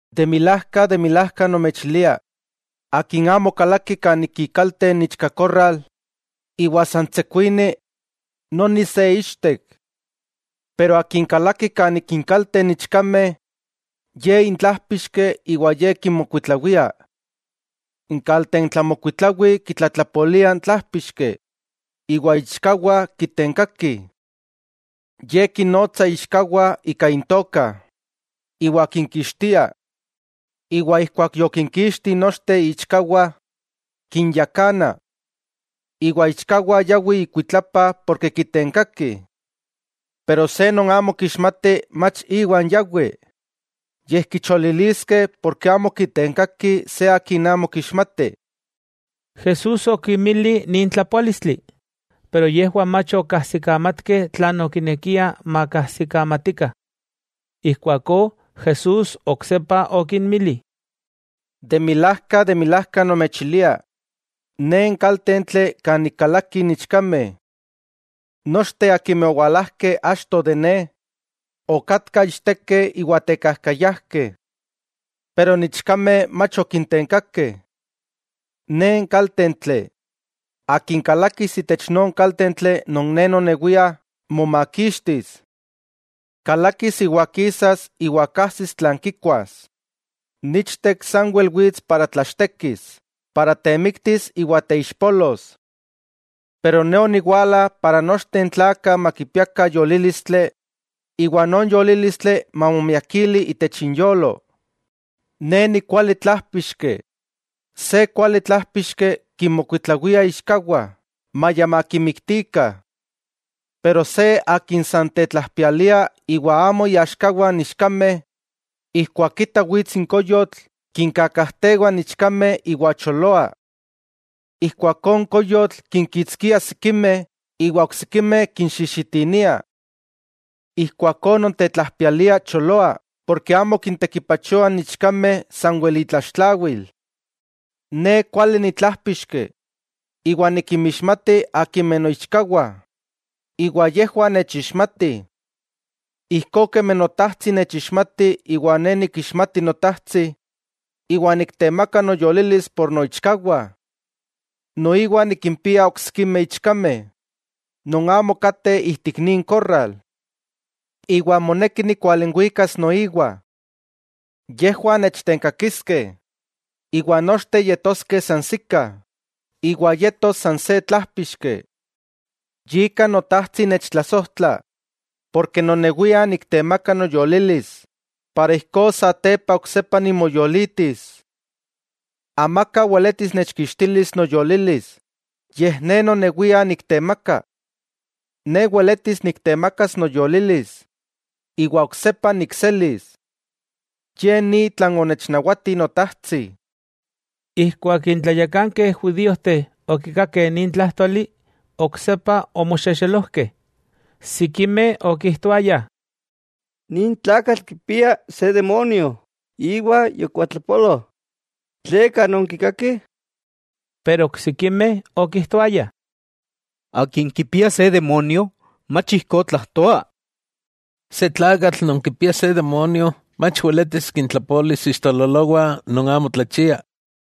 'De milajka, de milajka nomechilia, akin amo kalaki kan ik ikalte n ichkakorral iwa san tsekuini, noni se ichtek. Pero akin kalaki kan ik inkalte n ichkameh, ye intlájpixki iwa ye kinmokuitlawia. N kaltentlamokuitlawi kitlatlapolia n tlájpixki, iwa iichkawah kitenkakih. Ye kinnotsa iichkawah ika intoka, iwa kinkixtia. Iwa ijkuak yokinkixti nochteh iichkawah, kinyakana. Iwa iichkawah yawih ikuitlapa porke kitenkakih. Pero se non amo kixmati mach iwan yawi, yej kicholiliskeh porke amo kitenkakih se akin amo kixmatih. Jesús okinmili nin tlapoálistli, pero yejwah mach okajsikamatkeh tlan okinekia makajsikamatikah. Ijkuakó Jesús oksepa okinmili: —De milajka, de milajka nomechilia: Ne n kaltentli kan ik kalakih n ichkameh. Nochteh akimeh owalajkeh achto de Ne, okatkah ichtekeh iwa tekajkayajkeh. Pero n ichkameh mach okintenkakeh. Ne n kaltentli, akin kalakis itech non kaltentli non Ne nonewia, momakixtis. Kalakis iwa kisas iwa kajsis tlan kikuas. 'N ichtek sanwel wits para tlachtekis, para temiktis iwa teixpolos. Pero Ne oniwala para nochteh n tlakah makipiakah yolílistli, iwa non yolílistli mamomiakili itech inyolo. Ne nikuali tlájpixki. Se kuali tlájpixki kinmokuitlawia iichkawah, maya makimiktikah. Pero se akin san tetlajpialia iwa amo iaxkawah n ichkameh, ijkuak kita wits n koyotl kinkakajtewa n ichkameh iwa choloa. Ijkuakó n koyotl kinkitskia sikimeh, iwa oksikimeh kinxijxitinia. Ijkuakó non tetlajpialia choloa porke amo kintekipachoa n ichkameh sanwel itlaxtlawil. 'Ne kuali ni tlájpixki, iwa nikinmixmati akimeh noichkawah, iwa yejwah nechixmatih. Ijkó kemi Notajtsi nechixmati iwa Ne nikixmati Notajtsi, iwa niktemaka noyolilis por noichkawah. Noiwa nikimpia oksikimeh ichkameh, non amo kateh ijtik nin korral. Iwa moneki nikualinwikas noiwa. Yejwah nechtenkakiskeh, iwa nochteh yetoskeh sansikah, iwa yetos san se tlájpixki. 'Yika Notajtsi nechtlasojtla, porke nonewia niktemaka noyolilis, para ijkó satepa oksepa nimoyolitis. Amaka weletis nechkixtilis noyolilis, yej Ne nonewia niktemaka. Ne weletis niktemakas noyolilis, iwa oksepa nikselis. Ye ni tlan onechnawati Notajtsi. Ijkuak n tlayakankeh judíojteh okikakeh nin tlájtoli, oksepa omoxexelojkeh. Sikimeh okijtoayah: —Nin tlakatl kipia se demonio iwa yokuatlapolo. ¿Tleka nonkikakih? Pero oksikimeh okijtoayah: —Akin kipia se demonio mach ijkó tlajtoa. Se tlakatl non kipia se demonio mach weletis kintlapolis ixtololowah non amo tlachiah.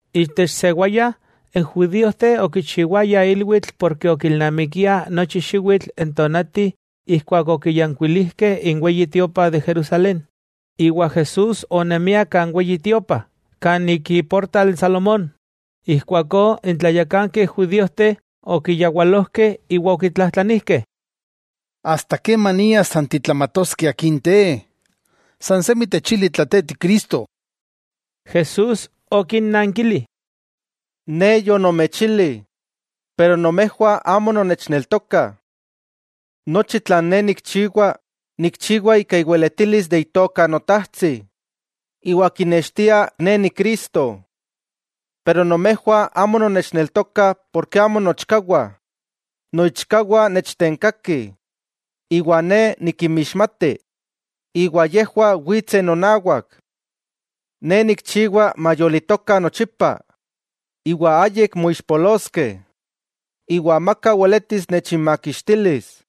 Itech sewaya n judíojteh okichiwayah ilwitl porke okilnamikiah nochi xiwitl n tonati ijkuak okiyankuilijkeh n Weyi Tiopa de Jerusalén. Iwa Jesús onemia kan Weyi Tiopa, kan ik iportal Salomón. Ijkuakó n tlayakankeh judíojteh okiyawalojkeh iwa okitlajtlanijkeh: —¿Asta kemania san titlamatoskeh akin te? Sansemi techili tla te ti Cristo. Jesús okinnankili: —Ne yonomechili, iwa nomejwah amo nonnechneltokah. Nochi tlan Ne nikchiwa, nikchiwa ika iweletilis itoka Notajtsi iwa kinextia Ne Ni Cristo. Pero nomejwah amo nonnechneltokah porke amo noichkawah. Noichkawah nechtenkakih, iwa Ne nikinmixmati, iwa yejwah witseh nonawak. Ne nikchiwa mayolitokah nochipa, iwa ayik moixpoloskeh, iwa amaka weletis nechinmakixtilis.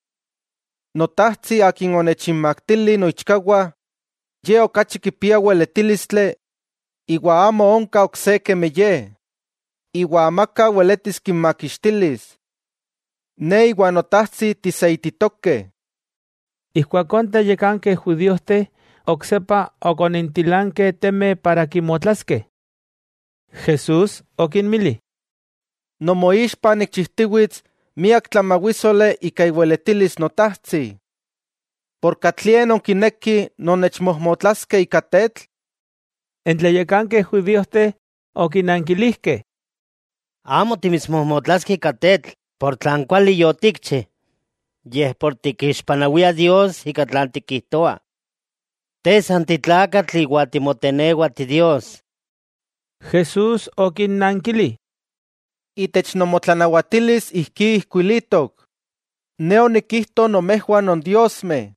Notajtsi Akin onechinmaktili noichkawah, Ye okachi kipia weletílistli iwa amo onka ok se kemi Ye, iwa amaka weletis kinmakixtilis. Ne iwa Notajtsi tiseititokeh. Ijkuakó n tlayakankeh judíojteh oksepa okonintilankeh temeh para kimotlaskeh. Jesús okinmili: —Nomoixpa nikchijtiwits miak tlamawísoli ika iweletilis Notajtsi, ¿katlie ika nonkinekih nonnechmojmotlaskeh ika tetl? N tlayakankeh judíojteh okinankilijkeh: —Amo timitsmojmotlaskeh ika tetl por tlan kuali yotikchi, yej por tikixpanawia Dios ika tlan tikijtoa. Te san titlakatl iwa timotenewa ti Dios. Jesús okinnankili: —Itech nomotlanawatilis ijkí ijkuilitok: “Ne onikijto nomejwah nondiosmeh.”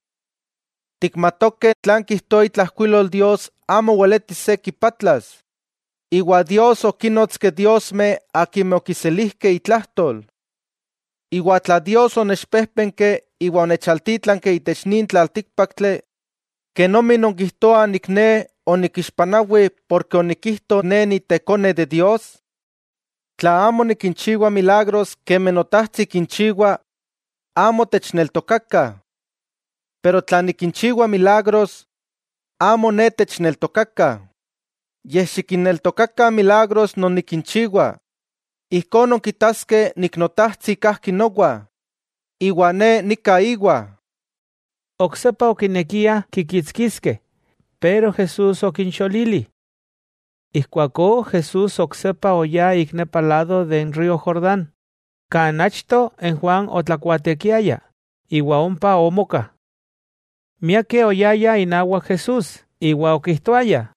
Tikmatokeh tlan kijtoa itlajkuilol Dios amo weletis se kipatlas; iwa Dios okínnotski diosmeh akimeh okiselijkeh itlajtol. Iwa tla Dios onechpéjpenki iwa onechaltítlanki itech nin tlaltíkpaktli, ¿kenomi nonkijtoah Ne onikixpanawi porke onikijto Ne Ni Tekone de Dios? Tla amo nikinchiwa milagros kemi Notajtsi kinchiwa, amo techneltokakah. Pero tla nikinchiwa milagros, amo Ne techneltokakah, yej xikinneltokakah n milagros non nikinchiwa, ijkó nonkitaskeh Notajtsi kajki nowa, iwa Ne nika íwa. Oksepa okinekiah kikitskiskeh, pero Jesús okincholili. Ijkuakó Jesús oksepa oyá ik nepa lado de n río Jordán, kan achto n Juan otlakuatekiaya iwa ompa omoka. Miakeh oyayah inawak Jesús iwa okijtoayah: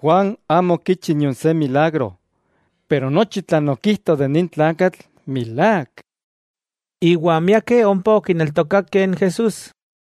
—Juan amo okichi nion se milagro, pero nochi tlan okijto de nin tlakatl milák. Iwa miakeh ompa okineltokakeh n Jesús.